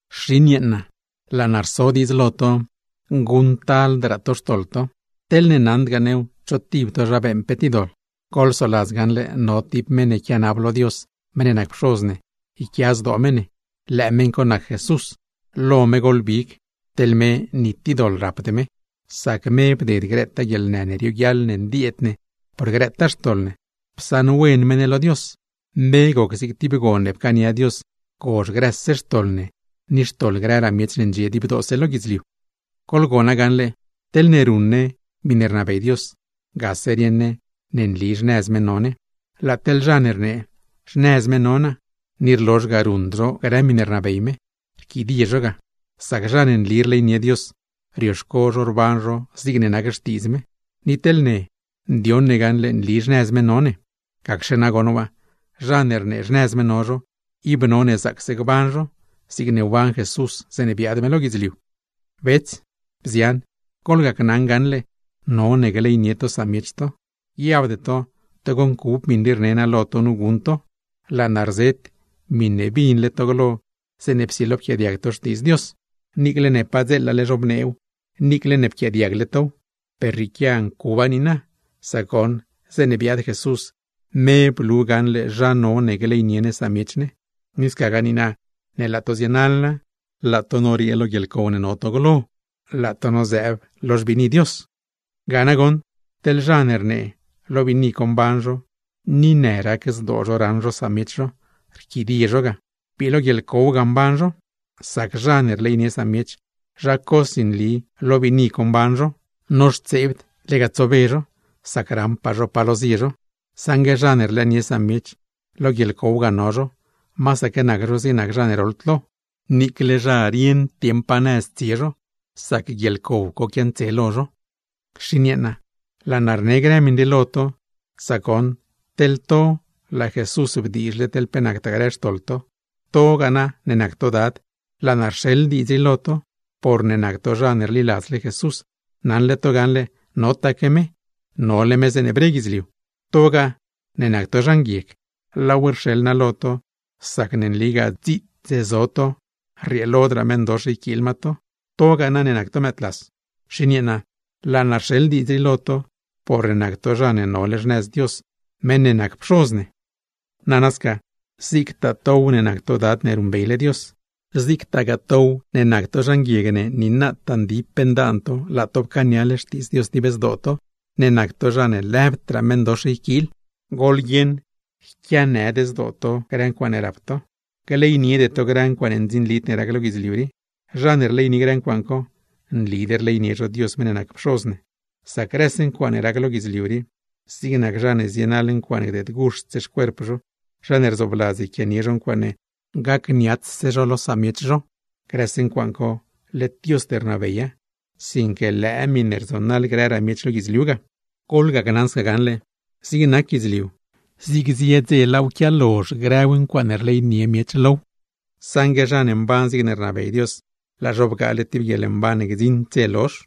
Xin yeeṉa, laa naa rso diidz lo to: Guṉctaldraa to xtoḻ to; teḻne naṉdgaa new cho tib to zha beeṉ pe tib doḻ, goḻsoladz gaṉle no tib meṉ ne quianab lo Dios meṉ ne nac Pxoz ne yquia zdoo me ne, lëë meṉ co nac Jesús, lo me goḻbig (teḻ me ni tib doḻ rapd me). Sac me bded grëtaa guieḻnë ne rioguiaḻ ne ndieed ne por grëtaa xtoḻ ne, psaṉwen me ne lo Dios; me goc zig tib gon ne pcaania Dios gozh grëse xtoḻ ne, ni xtoḻ grëraa miech ne ndxie dibdoose lo guidzliu. Goḻgona gaṉle: Teḻne ruṉ ne grëse miṉe rnabey Dios, gase rieṉ ne ne nli xnëz me no ne. Laa teḻ zha ne rnee: “Xnëz me no naa”, ni rlozh ga ruṉd zho grë miṉe rnabey me, rquidie zho ga. Sac zha ne nli rleynie Dios, rioxco zho rban zho zigne nac xtiidz me; ni teḻ ne, ndioṉ ne gaṉle nli xnëz me no ne. Gacxe nagoṉ waa, zha ne rnee xnëz me no zho, ib none zaacse gban zho, zigne wban Jesús zeeṉe biaad me lo guidzliu. Bets, bzian, goḻgacnaṉ gaṉle, none gleynie to samiech to. Guiabde to togo ncub miṉe rne naa lo to nu guṉ to, laa naa rzet miṉe binle to glo zeeṉe psilo pquiaadiag to Xtiidz Dios. Niicle ne padzeelale zhobneew, niicle ne pquiaadiagle tow, per rrieequia ncuba niina; sac goṉ zeeṉe biaad Jesús, me blu gaṉle zha none gleynie ne samiech ne. Ni scagaa niina ne laa to zienaḻa, laa to noriee lo guieḻcow ne no to glo, laa to nozëëb nëz lo xbiini Dios. Ga nagoṉ, teḻ zha ne rnee lo biini co mban zho ni rlëënie zho samiech zho, rquidie zho ga; bii lo guieḻcow ga mban zho. Zha ne rleynie samiech, zha cosi nli lo biini co mban zho, noxtseebd lega tsobe zho, sac raṉpaa zho pa lo zie zho; saṉgue zha ne rlëënie samiech, lo guieḻcow ga no zho. Masaque nac zho zig zha ne roḻd lo, niicle zha rieṉd dieṉ pa nëz tsie zho, sac guieḻcow co quiantse lo zho. Xin yeeṉa, laa naa rne grë miṉ rii lo to, sac goṉ, teḻ to laa Jesús bdiizhle teḻ pe nactaa grë xtoḻ to. To ne nac to dad, laa naa rxeḻ diidz rii lo to, porne nac to zha ne rliladzle Jesús, naṉle to gaṉle notaque me, nole me zeeṉe bre guidzliu. Togaa ne nac to zha nguieg, laaw rxeḻ naa lo to, sacne nligaa dziits zo to, rrieelodraa meṉdox yquiil ma to. To ne nac to mëëdlas, xin yeeṉa laa naa rxeḻ diidz rii lo to, porne nac to zha ne nole xnëz Dios meṉ ne nac Pxoz ne. Nana sca, zigtaa tow ne nac to dad ne ruṉbeyle Dios; zigtagaa tow ne nac to zha nguieg, ne nataa ndip ndaan to laa to pcaaniale Xtiidz Dios dib zdoo to, ne nac to zha ne lëbdraa meṉdox yquiil, goḻguieṉ, gleyniede to grë ncuaaṉe rap to, gleyniede to grë ncuaaṉ ndzinlid ne rac lo guidzliu rii. Zha ne rleynie grë ncuaaṉ co, nlid rleynie zho Dios meṉ ne nac Pxoz ne; sac grëse ncuaaṉe rac lo guidzliu rii (zig nac zha ne zienaḻ ncuaaṉe gdeedguxt xcuerp, zha ne rzoobladz yquianie ncuaaṉe rdziladztaa, zha ne racniats lo samiech), grëse ncuaaṉ co led Diosd rnabeya, sinque lëë miṉe rzonaḻ grëraa miech lo guidzliu ga. Ni na teḻ zig nac guidzliu, zig zie dze laaw quialozh grëw grë ncuaaṉe rleynie miech low; saṉgue zha ne mban zigne rnabey Dios, laa zho bgaale tib guieḻmban ne gdziṉd dze lozh.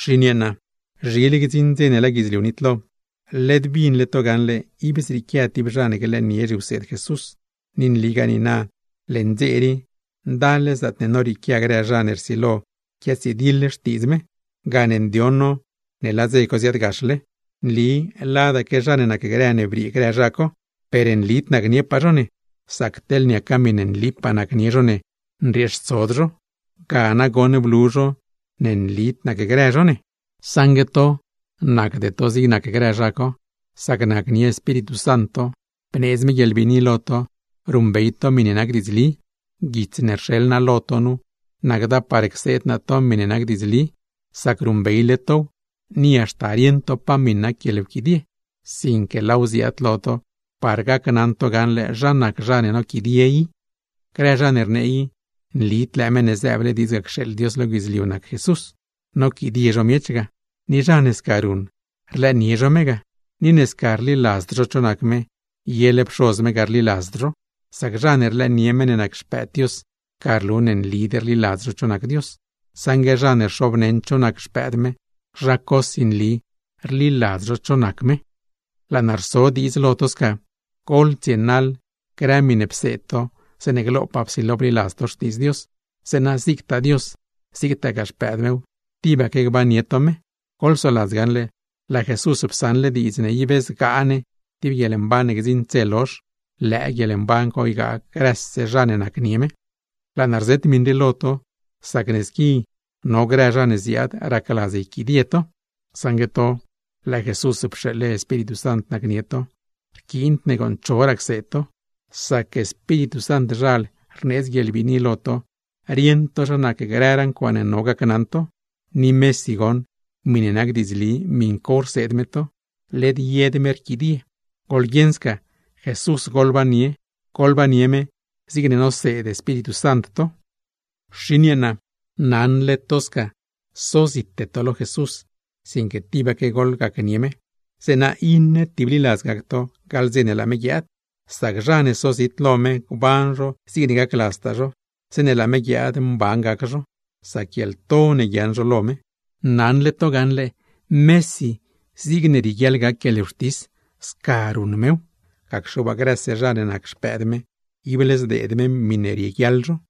Xin yeeṉa, zhile gdziṉ dze ne laa guidzliu nitlo. Led binle to gaṉle ib zrieequia tib zha ne glëënie zhiwseed Jesús, ni nligaa niina leṉ dze rii ndal-le zaatne norieequia grë zha ne rsilo quiatsidiḻ Xtiidz me; gane ndioṉ no ne laa dze co ziaadgaxle. Nli ladaque zha ne nacgrë ne briee grë zha co, per nlid nacniepaa zho ne; sac teḻ niaca miṉe nlipaa nacnie zho ne, nrieextsod zho. Ga nagoṉ blu zho ne nlid nacgrë zho ne. Saṉgue to, nacde to zig nac grë zha co, sac nacnie Espíritu Sant to, bneedz me guieḻbiini lo to ruṉbey to miṉe nac diidzli. Guits ne rxeḻ naa lo to nu, nacda par cseed naa to miṉe nac diidzli, sac ruṉbeyle tow ni haxta rieṉ to pa miṉ nac guieḻwquidie; sinque laaw ziaad lo to par gacnaṉ to gaṉle zha nac zha ne noquidie i. Grë zha ne rnee i nlid lëë Meṉ ne zëëble diidz cxeeḻ Dios lo guidzliu ga nac Jesús, noquidie zho miech ga. Ni zha ne sca ruṉ, rlëënie zho me ga; ni ne sca rliladzd zho cho nac me, yele Pxoz me ga rliladzd zho. Sac zha ne rlëënie meṉ ne nac Xpëëd Dios, ga rlu ne nlid rliladz zho cho nac Dios; saṉgue zha ne rxobneṉ cho nac Xpëëd me, zha cosi nli rliladz zho cho nac me. Laa naa rso diidz lo to sca: Goḻtsienaḻ grë miṉe pseed to zeeṉe glopaa psilo bliladz to Xtiidz Dios, zeeṉa zigtaa Dios, zigtagaa Xpëëd mew, tibaque gbannie to me. Goḻsoladz gaṉle, laa Jesús psaṉle diidz ne ib zgaa ne tib guieḻmban ne gdziṉd dze lozh; lëë guieḻmban co ygaa grëse zha ne nacnie me. Laa naa rzet miṉ rii lo to, sac ne squi no grë zha ne ziaad racladz yquidie to. Saṉgue to laa Jesús pxeeḻle Espíritu Sant nacnie to, rquiind ne gooṉ choraa cseed to; sac Espíritu Santzhal rneedz guieḻbiini lo to rieṉ to zha nac grëraa ncuaaṉe no gacnaṉ to, ni mesi goṉ miṉe nac diidzli miṉ co rseed me to, led yed me rquidie. Goḻguieṉ sca, Jesús goḻbannie, goḻbannie me zigne noseed Espíritu Sant to. Xin yeeṉa, naṉle to sca sozite to lo Jesús, sinque tibaque goḻgacnie me; zeeṉa iṉe tibliladz gac to gaḻ dze ne laa me guiaad. Sac zha ne sozit lo me gban zho zigne gacladztaa zho, zeeṉe laa me guiaad mban gac zho; sac guieḻto ne guiaaṉ zho lo me. Naṉle to gaṉle, mesi zigne rieguiaḻ gac guieḻwxtis sca ruṉ mew; gacxe waa, grëse zha ne nac xpëëd me ible zdeed me miṉe rieguiaḻ zho.